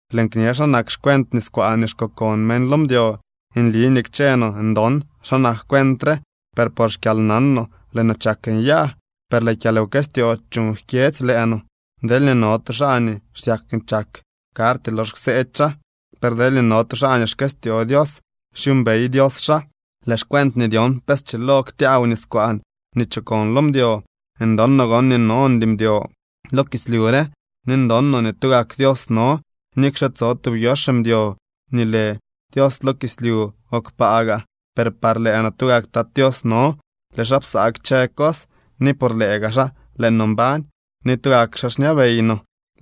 Lëën kñe xa nak xcuent niskwaan nii xkokon meñ lo mdyo. Nli nii kchë no ndon xa nak cuent re, per por xkyalnan no lëë no chak nyaa, per lëë kyalwkëstyoo chuuñ jkyedzy lëë no. Deelñee no tu xaa nii xsyak nii chak, karty lox kseedy xaa. Per deelñee no tu xaa nii xkëstyoo Dios, xyuumbey Dios xaa. Lëë xcuent nii dyon pe schilo ktyaaw niskwaan nii chokon lo mdyo, ndon no gon nii nondy mdyo lo kislyu re, ni ndon no nii tugak Dios no. Nikxe tso tub yox mdyo nii lë dios lo kislyu o kpaa gaa, per par lëë no tugak Tat Tios no. Lëë xaa psaa kchë cos, ni por lëë gaa xaa lëë no mbañ. Ni tugak xaa xñabey no.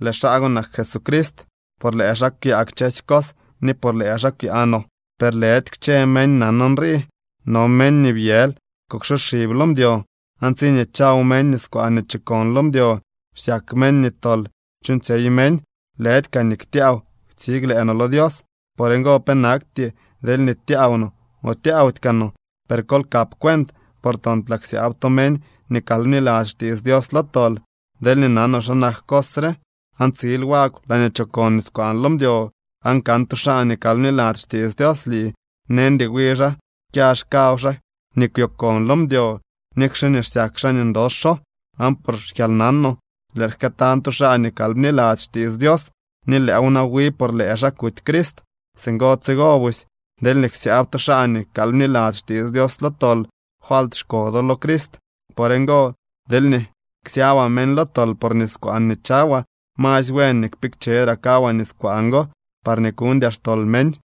Lëë xaa go nak Jesucrist. Por lëë xaa kwyaa kchësy cos, ni por lëë xaa kwyaa no. Per lëdy kchë meñ nan nrii. No meñ nii byël kuksoxib lo mdyo, aan tsiñee chaw meñ niskwaan nii chokon lo mdyo, xsyak meñ nii tol chuuñtsyey meñ. Lëdy kaa nii ktyaaw ktsig lëë no lo Dios. Por ngo pe nakty deelñee tyaaw no o tyaawdy kaa no. Per kol kap cuent, por toontlaa ksyaab to meñ nii kal bniladzy xtiits Dios lo tol. Deelñee nanoo xa nak cos re aan tsil wagw laañee chokon niskwaan lo mdyo, aan kan tu xaa nii kal bniladzy xtiits Dios lii, neñdy wi xaa kyax kaw xaa nii kwyokon lo mdyo, nikxe nii xsyak xaa nii ndoxo. Aan por xkyalnanoo lëël jkëëtañ tu xaa nii kal bniladzy xtiits Dios, ni lëëw na wi por lëë xaa kuty Crist. Singo tsigo busy deelñee ksyaab to xaa nii kal bniladzy xtiits Dios lo tol, falt xko do lo Crist. Por ngo, deelñee ksyaabaa meñ lo tol por niskwaan nii chawaa, masy buen nii kpikchedraa kawaa niskwaan go, parñee kuñdyaa xtol meñ.